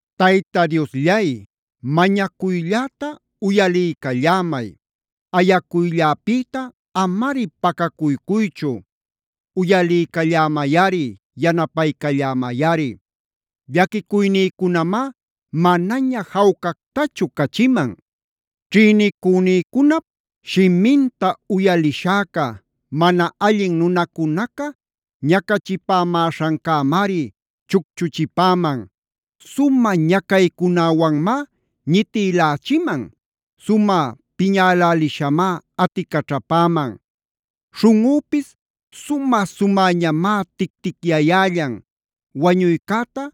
Tayta Diosllay, mañacuylläta uyaliycallämay. Ayacuylläpïta amari pacacuycuychu. Uyaliycallämayꞌari yanapaycallämayꞌari. Llaquicuynïcunamá manaña jawcactachu cachiman. Ćhïnicünïcunap shiminta uyalishäca, mana allin nunacunaca ñacachipämäśhancämari chucchuchipäman. Sumä ñacaycunäwanmá ñitïlächiman. Sumä piñäläliśhamá aticaćhapäman. Śhunꞌüpis sumä-sumäñamá tic-ticyayällan. Wañuycäta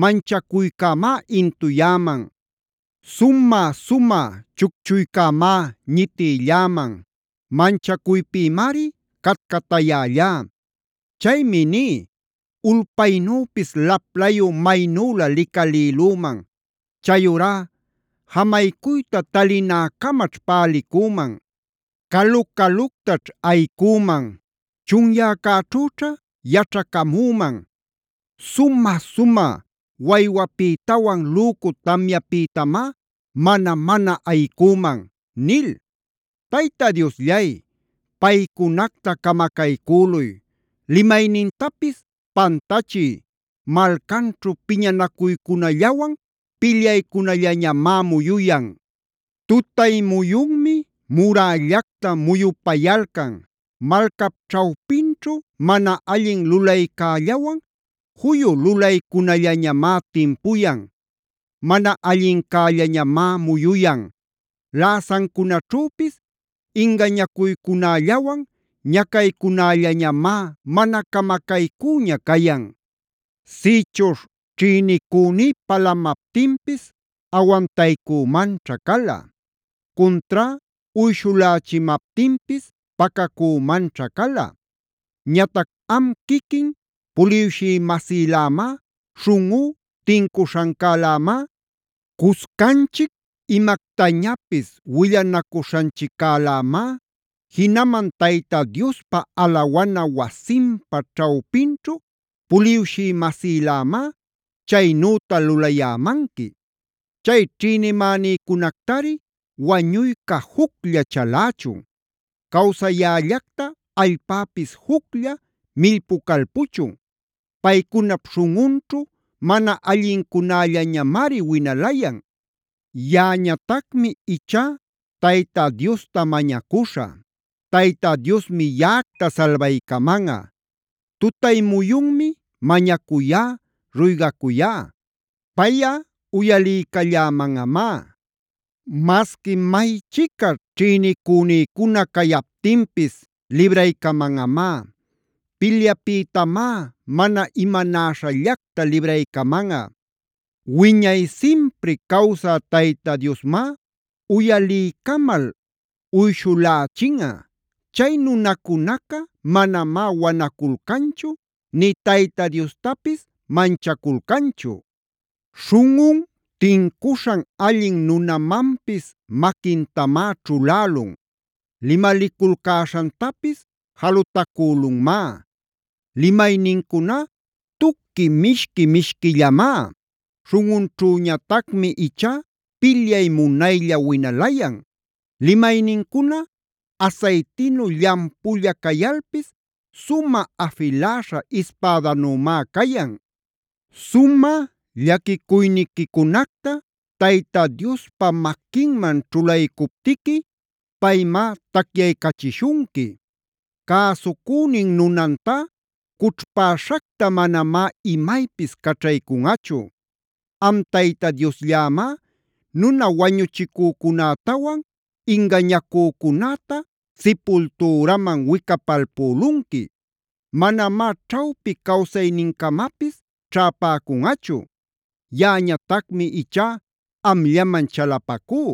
manchacuycämá intuyäman. Sumä-sumä chuchuycämá ñitïlläman. Manchacuypïmari catcatayällá. Chaymi ní: “Ulpaynüpis laplayu maynülä licalïlüman. Chayurá jamaycuyta talinäcamaćh pälicüman. Calu-caluctaćh ayicüman. Chunyäcäćhüćha yaćhacamüman. Sumä-sumä waywäpïtawan lücu tamyäpïtamá mana-mana ayicüman” nil. Tayta Diosllay, paycunacta camacaycüluy. Limaynintapis pantachiy. Malcaćhu piñanacuycunallawan pilyaycunallañamá muyuyan. Tutay muyunmi murällacta muyupayalcan. Malcap ćhawpinćhu mana allin lulaycällawan juyu lulaycunallañamá timpuyan. Mana allincällañamá muyuyan. Läsancunaćhüpis ingañacuycunällawan ñacaycunällañamá mana camacaycüña cayan. Sïchuśh ćhïnicüní palamaptinpis awantaycümanćha cala. Cuntrá uyshulächimaptinpis pacacümanćha cala. Ñatac am quiquin puliwshï-masïlämá, śhunꞌú tincuśhancälämá, cuscanchic imactañapis willanacuśhanchiccalämá, jinaman Tayta Diospa alawana wasinpa ćhawpinćhu puliwshï-masïlämá chaynüta lulayämanqui. Chay ćhïnimänïcunactari wañuyca juclla chalächun. Cawsayällacta allpäpis juclla millpucalpuchun. Paycunap śhunꞌunćhu mana allincunällañamari winalayan. Yaꞌañatacmi ichá Tayta Diosta mañacuśhä. Tayta Diosmi yaꞌactá salbaycamanꞌa. Tutay muyunmi mañacuyá, ruygacuyá. Payꞌa uyaliycallämanꞌamá. Masqui maychica ćhïnicünïcuna cayaptinpis libraycamanꞌamá. Pilyapïtamá mana imanäśhallacta libraycamanꞌa. Wiñay simpri cawsä Tayta Diosmá uyaliycamal uyshulächinꞌa. Chay nunacunaca manamá wanaculcanchu nï Tayta Diostapis manchaculcanchu. Śhunꞌun tincuśhan allin nunamanpis maquintamá ćhulälun. Limaliculcäśhantapis jalutacülunmá. Limaynincuná tuqui mishqui-mishquillamá. Śhunꞌunćhüñatacmi ichá pilyay munayllaña winalayan. Limaynincuna asaytinu llampulla cayalpis sumä afiläśha ispädanümá cayan. Sumä llaquicuyniquicunacta Tayta Diospa maquinman ćhulaycuptiquia paymá tacyaycachishunqui. Cäsucünin nunantá cućhpäśhacta manamá imaypis caćhaycunꞌachu. Am Tayta Diosllämá nuna wañuchicücunätawan ingañacücunäta sipultüraman wicapalpülunqui. Manamá ćhawpi cawsaynincamapis ćhäpäcunꞌachu. Yaꞌañatacmi ichá amllaman chalapacú.